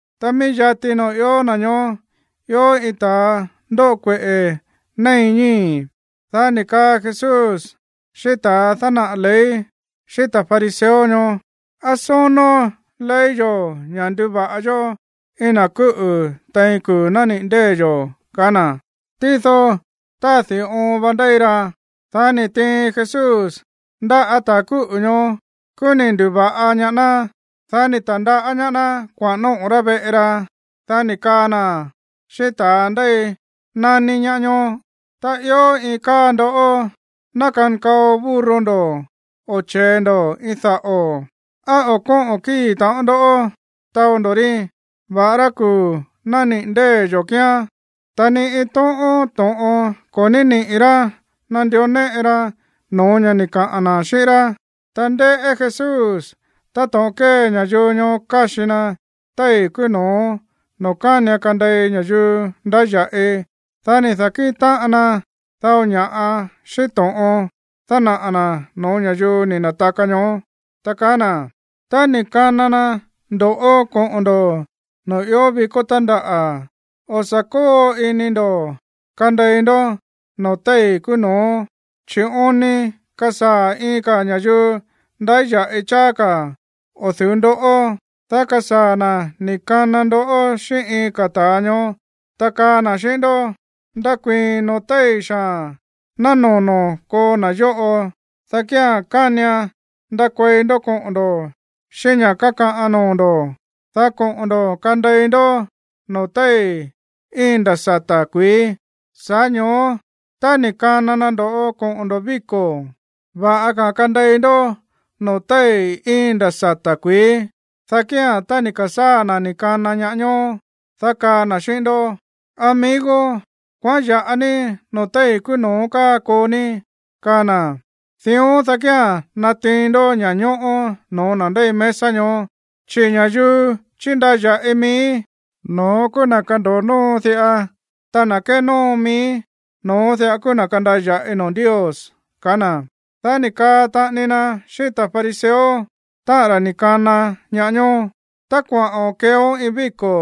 Ta mií yati noo̱ ió na̱ ñoó ió iin ta̱a ndóꞌo kueꞌe̱ néin ñíi̱. Dá ni̱ kaa Jesús xíꞌín ta̱a dánaꞌa̱ ley, xíꞌín ta̱ fariseo ñoó: ―¿Á sónó ley yo̱ ña̱ nduva̱ꞌa yó iin na̱ kúꞌu̱ tein kuu̱ nániꞌi̱ ndée̱ yo̱? ―kaá na̱. Tído tádi̱ oon va ndéi ra. Dá ni̱ tiin Jesús ndáꞌa̱ ta̱ kúꞌu̱ ñoó. Kúú ni̱ ndu̱va̱ꞌa ñaá ná. Dá ni̱ ta̱ndaꞌá ñaá ná kuaꞌa̱n nóꞌo̱ rá veꞌe ra. Dá ni̱ kaa na̱ xíꞌín ta̱a ndéi nání ñaá ñoó: ―Tá ió iin káa ndó ná kankao burro ndo̱ o che̱e ndo̱ ini daꞌo̱, ¿á o̱ kóꞌo̱n kíi̱ taꞌon ndó taó ndo̱ rí, va̱ꞌará kuu̱ nániꞌi̱ ndée̱ yo̱ kíán? Ta ni iin tóꞌón to̱ꞌon ko̱ ní niꞌi̱ rá nandió néꞌe ra no̱ó ña̱ ni̱ kaꞌa̱n na̱ xíꞌín rá. Ta ndéꞌé Jesús táto̱ꞌon kée ña̱yuu ñoó káxi na téi̱ kúú no̱ó noo̱ kánian kande̱i ña̱yuu ndáya̱ꞌi. Dá ni̱ da̱kíꞌin táꞌan na dao ña̱ꞌa xíꞌín to̱ꞌon dánaꞌa̱ na̱ no̱ó ña̱yuu ni̱ na̱taka ñoó, ta kaá na̱: ―Tá ni̱ kana na ndo̱ꞌó koꞌo̱n ndo̱ noo̱ ió vikó tándaꞌa̱, o̱ sa̱ kóo ini ndo̱ kande̱i ndó noo̱ téi̱ kúú no̱ó, chi̱ oon ni kasaa̱ iin ka̱ ña̱yuu ndáya̱ꞌi cháá ka̱ o̱ du̱ú ndoꞌó, dá kasaa̱ na̱ ni̱ kana ndoꞌó xíꞌín iin ka̱ ta̱a ñoó, ta kaa na̱ xíꞌín ndó: “Ndakuii̱n noo̱ téi̱ xaa̱n ná nono̱ ko̱o na̱ yóꞌo.” Dá kía̱n kánian ndakuei ndó koꞌo̱n ndo̱ xíꞌín ña̱ kakaꞌan noo̱ ndo̱, dá koꞌo̱n ndo̱ kande̱i ndó noo̱ téi̱ íin nda̱ sata̱ kuií. Sa̱ꞌá ño̱ó tá ni̱ kana na ndo̱ꞌó koꞌo̱n ndo̱ víko̱, va̱ꞌa ka̱ kande̱i ndó noo̱ téi̱ íin nda̱ sata̱ kuií. Dá kía̱n tá ni̱ ka̱sáa̱ na̱ ni̱ kana ñaá ñoó, dá kaa na̱ xíꞌín ndó: “Amigo, kuaꞌán ya̱ꞌa ní noo̱ téi̱ kúú no̱ó káa koo ní” kaa na̱. Dión, dá kía̱n natiin ndó ña̱ñóꞌó no̱ó na̱ ndéi mesa ñoó. Chi̱ ña̱yuu chíndaya̱ꞌi mií, no̱ón kúú na̱ kando̱o nóo diꞌa. Ta na̱ kénóo mií, no̱ón diꞌa kúú na̱ kandaya̱ꞌi noo̱ Ndios ―kaá na̱. Dá ni̱ kaa taꞌani na xíꞌín ta̱ fariseo, táꞌa̱n ra̱ ni̱ kana ñaá ñoó: ―Tá kuaꞌo̱n keeón iin víko̱,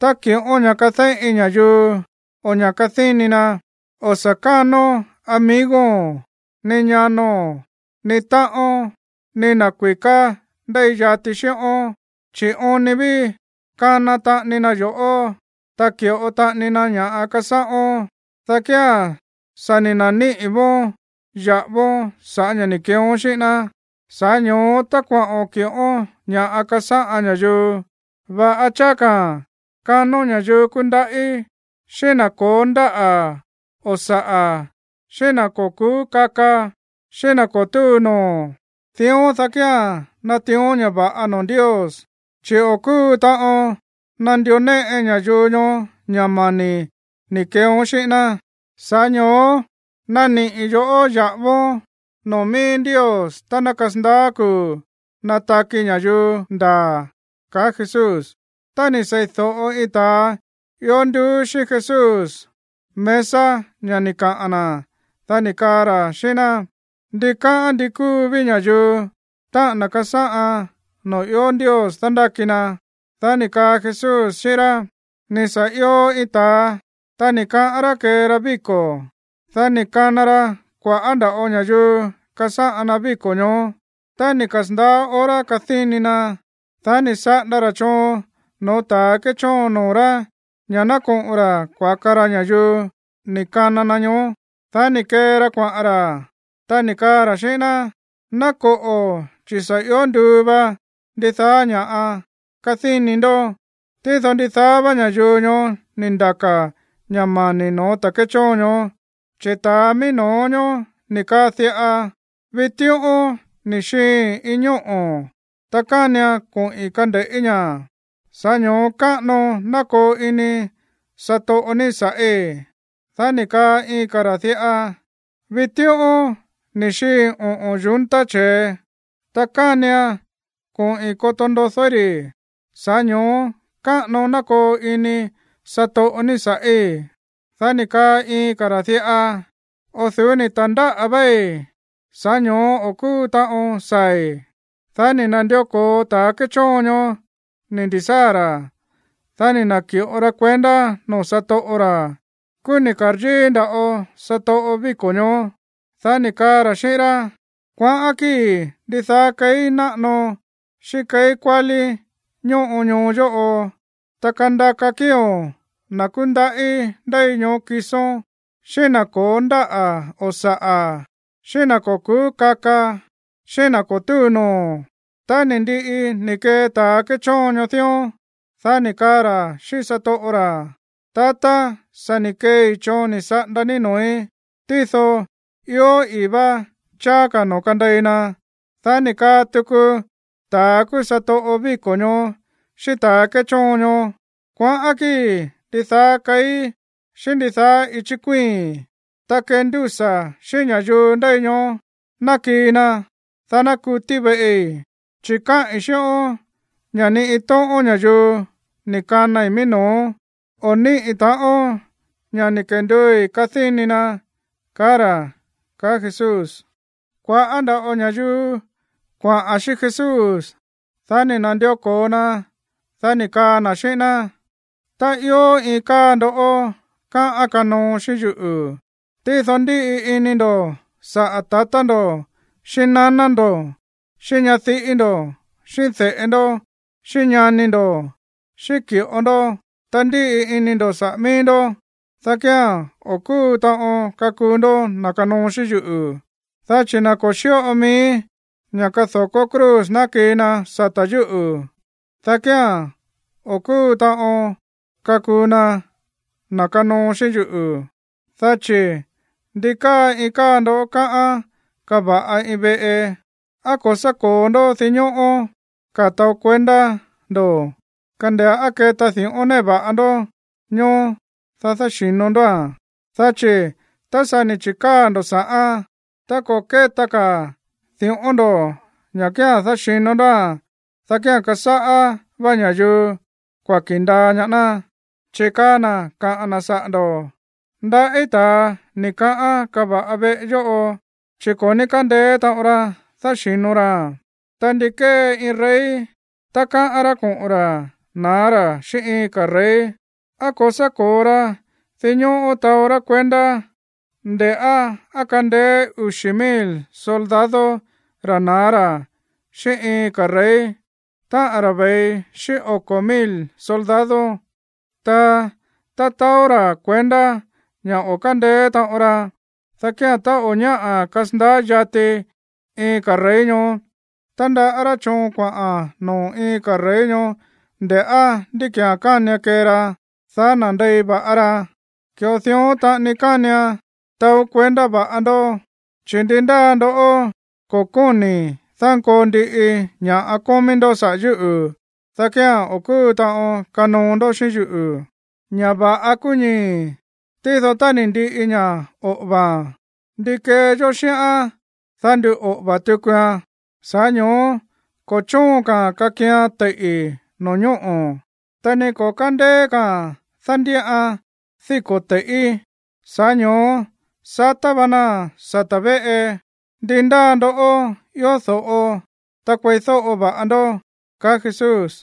tá kiꞌón ña̱ kadéꞌin ña̱yuu o ña̱ꞌa kadíni na, o̱ sa̱ kánón amigo̱n, ni ñano̱n, ni táꞌón, ni na̱ kui̱ká ndéi yati xíꞌón. Chi̱ oon ni ví kana taꞌani na yo̱ꞌó, ta ki̱ꞌo taꞌani na ña̱ꞌa kasáꞌón, dá kía̱n sa̱ ni̱ na̱níꞌi̱ vóón ya̱ꞌávón sa̱ꞌá ña̱ ni̱ keeón xíꞌín ná. Sa̱ꞌá ño̱ó tá kuaꞌo̱n kiꞌón ña̱ꞌa kasáꞌan ña̱yuu, va̱ꞌa cháá ka̱a̱n kanón ña̱yuu kúndaꞌí, xíꞌín na̱ ko̱ó ndáꞌa̱ o saꞌa̱, xíꞌín na̱ ko̱ ku̱ú kaka, xíꞌín na̱ ko̱ túu noo̱, dión, dá kía̱n natiión ña̱ va̱ꞌa noo̱ Ndios, chi̱ o̱ kúu taꞌon nandió néꞌe ña̱yuu ñoó ña̱ mani̱ ni̱ keeón xíꞌín ná, sa̱ꞌá ño̱ó naniꞌi̱ yo̱ꞌó ya̱ꞌávón noo̱ mií Ndios tá ná kasandaá kuu̱ nataki ña̱yuu ndaa̱ ―kaá Jesús. Tá ni̱ sei̱do̱ꞌo iin ta̱a ió nduú xíꞌín Jesús mesa ña̱ ni̱ kaꞌa̱n na̱, dá ni̱ kaa ra̱ xíꞌín ná: ―Ndikáꞌán ndi kúu ví ña̱yuu, táꞌa̱n na̱ kasáꞌan noo̱ ió Ndios dándáki na. Dá ni̱ kaa Jesús xíꞌín rá: ―Ni̱ sa̱ io iin ta̱a, ta ni̱ kaꞌán rá kee ra víko̱. Dá ni̱ kana ra kua̱ꞌá nda̱ꞌo ña̱yuu kasáꞌan na víko̱ ñoó. Tá ni̱ kasa̱ndaá hora kadíni na, dá ni̱ saꞌanda ra̱ choon no̱ó ta̱ kéchóon noo̱ rá ña̱ ná koꞌo̱n ra̱ kuaka ra ña̱yuu ni̱ kana na ñoó. Dá ni̱ kee ra kuaꞌa̱n ra̱, ta ni̱ kaa ra̱ xíꞌín ná: “Ná koꞌo̱, chi̱ sa̱ io nduu va ndidaá ña̱ kadíni ndó.” Tído ndidaá vá ña̱yuu ñoó ni̱ ndaka̱ ña̱ mani̱ no̱ó ta̱ kéchóon ñoó. Chi̱ ta̱a mií no̱ó ñoó ni̱ kaa diꞌa: “Vitíꞌón ni̱ xiiin iin ñóꞌo̱, ta kánian koꞌi̱n kande̱ꞌí ña̱. Sa̱ꞌá ño̱ó káꞌano ná koo ini satoꞌo ní sa̱ꞌí.” Dá ni̱ kaa iin ka̱ ra̱ diꞌa: “Vitíꞌón ni̱ xiiin oꞌo̱n yunta che̱e, ta kánian koꞌi̱n koto ndodóí ri̱. Sa̱ꞌá ño̱ó káꞌano ná koo ini satoꞌo ní sa̱ꞌí.” Dá ni̱ kaa iin ka̱ ra̱ diꞌa: “O̱ du̱ú ni̱ ta̱ndáꞌa̱ véí, sa̱ꞌá ño̱ó o̱ kúu taꞌon saa̱i̱.” ’Dá ni̱ na̱ndió ko̱o ta̱ kéchóon ñoó ni̱ ndi̱sáa̱ ra̱, dá ni̱ na̱ki̱ꞌo ra kuendá noo̱ satoꞌo ra̱. Kúú ni̱ ka̱ryíí nda̱ꞌo satoꞌo víko̱ ñoó. Dá ni̱ kaa ra̱ xíꞌín rá: “Kuaꞌán kíi̱ ndidaá keí náꞌano xíꞌín keí kuálí ñóꞌo ñoo yóꞌo, ta kandaka kíi̱o̱n na̱ kúndaꞌí ndéi ñoó kisón, xíꞌín na̱ ko̱ó ndáꞌa̱ o saꞌa̱, xíꞌín na̱ ko̱ ku̱ú kaka, xíꞌín na̱ ko̱ túu noo̱.” Tá ni̱ ndiꞌi ni̱ kee ta̱ kéchoon ñoó dión, dá ni̱ kaa ra̱ xíꞌín satoꞌo ra̱: “Tatá, sa̱ ni̱ keei choon ni̱ saꞌanda ní noo̱í. Tído ió i̱í vá cháá ka̱ noo̱ kandei na.” Dá ni̱ kaa tuku ta̱a kúú satoꞌo víko̱ ñoó xíꞌín ta̱ kéchóon ñoó: “Kuaꞌán kíi̱ ndidaá keí xíꞌín ndidaá íchi̱ kuíi̱n, ta kendúsa̱ xíꞌín ña̱yuu ndéi ñoó ná kii na, dá ná kutí veꞌi. Chi̱ káꞌi̱n xíꞌón ña̱ ni iin tóꞌón ña̱yuu ni̱ kanai mií no̱ó, o̱ níꞌi̱ ta̱ꞌón ña̱ ni̱ kenduui̱ kadíni na”, kaá ra̱ ―kaá Jesús. Kua̱ꞌá nda̱ꞌo ña̱yuu kuaꞌa̱n xíꞌín Jesús. Dá ni̱ na̱ndió ko̱o na, dá ni̱ kaa na̱ xíꞌín ná: ―Tá ió iin káa ndó káꞌán kanoo xíꞌín yuꞌu̱, tído ndíꞌi ini ndo̱ saꞌa̱ tatá ndo̱ xíꞌín naná ndo̱, xíꞌín ñadiꞌí ndo̱, xíꞌín de̱ꞌe ndó, xíꞌín ñani ndo̱, xíꞌín ki̱ꞌo ndó, ta ndíꞌi ini ndo̱ saꞌa̱ mií ndó, dá kía̱n o̱ kúu taꞌon kakuu ndó na̱ kanoo xíꞌín yuꞌu̱. Dá chi̱ na̱ ko̱ xíꞌo mií ña̱ kado̱kó cruz ná kii na sata̱ yúꞌu̱, dá kía̱n o̱ kúu taꞌon kakuu na na̱ kanoo xíꞌín yuꞌu̱. Dá chi̱, ¿ndi káa iin káa ndó káꞌán kava̱ꞌa iin veꞌe, á ko̱ sá ko̱o ndó dinñóꞌó ka̱ taó kuendá ndo̱, kande̱ꞌá á keta di̱ꞌón néꞌe va̱ꞌa ndó ñoó, dá dáxi̱no ndóa̱n? Dá chi̱ tá sa̱ ni̱ chi̱káa̱ ndo̱ sa̱ꞌán, ta ko̱ kéta ka̱ di̱ꞌón ndo̱ ña̱ kía̱n dáxi̱no ndóa̱n, dá kía̱n kasáꞌá vá ña̱yuu kuaki̱ ndaa ñaá ná, chi̱ kaa na̱ kaꞌa̱n na̱ saꞌa̱ ndo̱: “Ndaꞌí ta̱a ni̱ kaꞌán kava̱ꞌa veꞌe yóꞌo, chi̱ ko̱ ní kándeé taꞌon ra dáxi̱no raa̱n.” ’Ta, ¿ndi kée iin rey tá káꞌán rá koꞌo̱n ra̱ na̱á ra̱ xíꞌín iin ka̱ rey? ¿Á ko̱ sá ko̱o ra dinñóꞌó taó rá kuendá, nde̱ꞌá á kandeé uxi̱ mil soldado ra̱ na̱á ra̱ xíꞌín iin ka̱ rey, táꞌa̱n ra̱ ve̱i xíꞌín oko̱ mil soldado? Ta tá taó ra̱ kuendá ña̱ o̱ kándeé taꞌon ra, dá kía̱n, tá o̱ ñáꞌa̱ kasandaá yati iin ka̱ rey ñoó, tandaꞌá rá choon kuaꞌa̱n noo̱ iin ka̱ rey ñoó nde̱ꞌá ndí ki̱án kánian kee ra, dá nandei va̱ꞌa ra. Ki̱ꞌo dión taꞌani kánian taó kuendá va̱ꞌa ndó, chi̱ ndi ndáa ndó ko̱ kóni̱ dánkoo ndiꞌi ña̱ꞌa kómí ndó saꞌa̱ yúꞌu̱, dá kía̱n o̱ kúu taꞌon kanoo ndó xíꞌín yuꞌu̱. ’Ña̱ va̱ꞌa kúú ñii̱, tído tá ni̱ ndiꞌi ña̱ oꞌo̱va̱a̱n, ¿ndi kee yó xíꞌán, dá nduꞌoꞌo̱va̱ tukuan? Sa̱ꞌá ño̱ó ko̱ chóon ka̱a̱n kakian teiꞌi̱ no̱ñóꞌo̱, ta ni ko̱ kándeé ka̱a̱n dándíꞌan díko̱ te̱i̱ꞌí. Sa̱ꞌá ño̱ó satá va naa̱n sata̱ véꞌe. Ndi ndáa ndoꞌó ió do̱ꞌo, ta kueídóꞌo va̱ꞌa ndó ―kaá Jesús.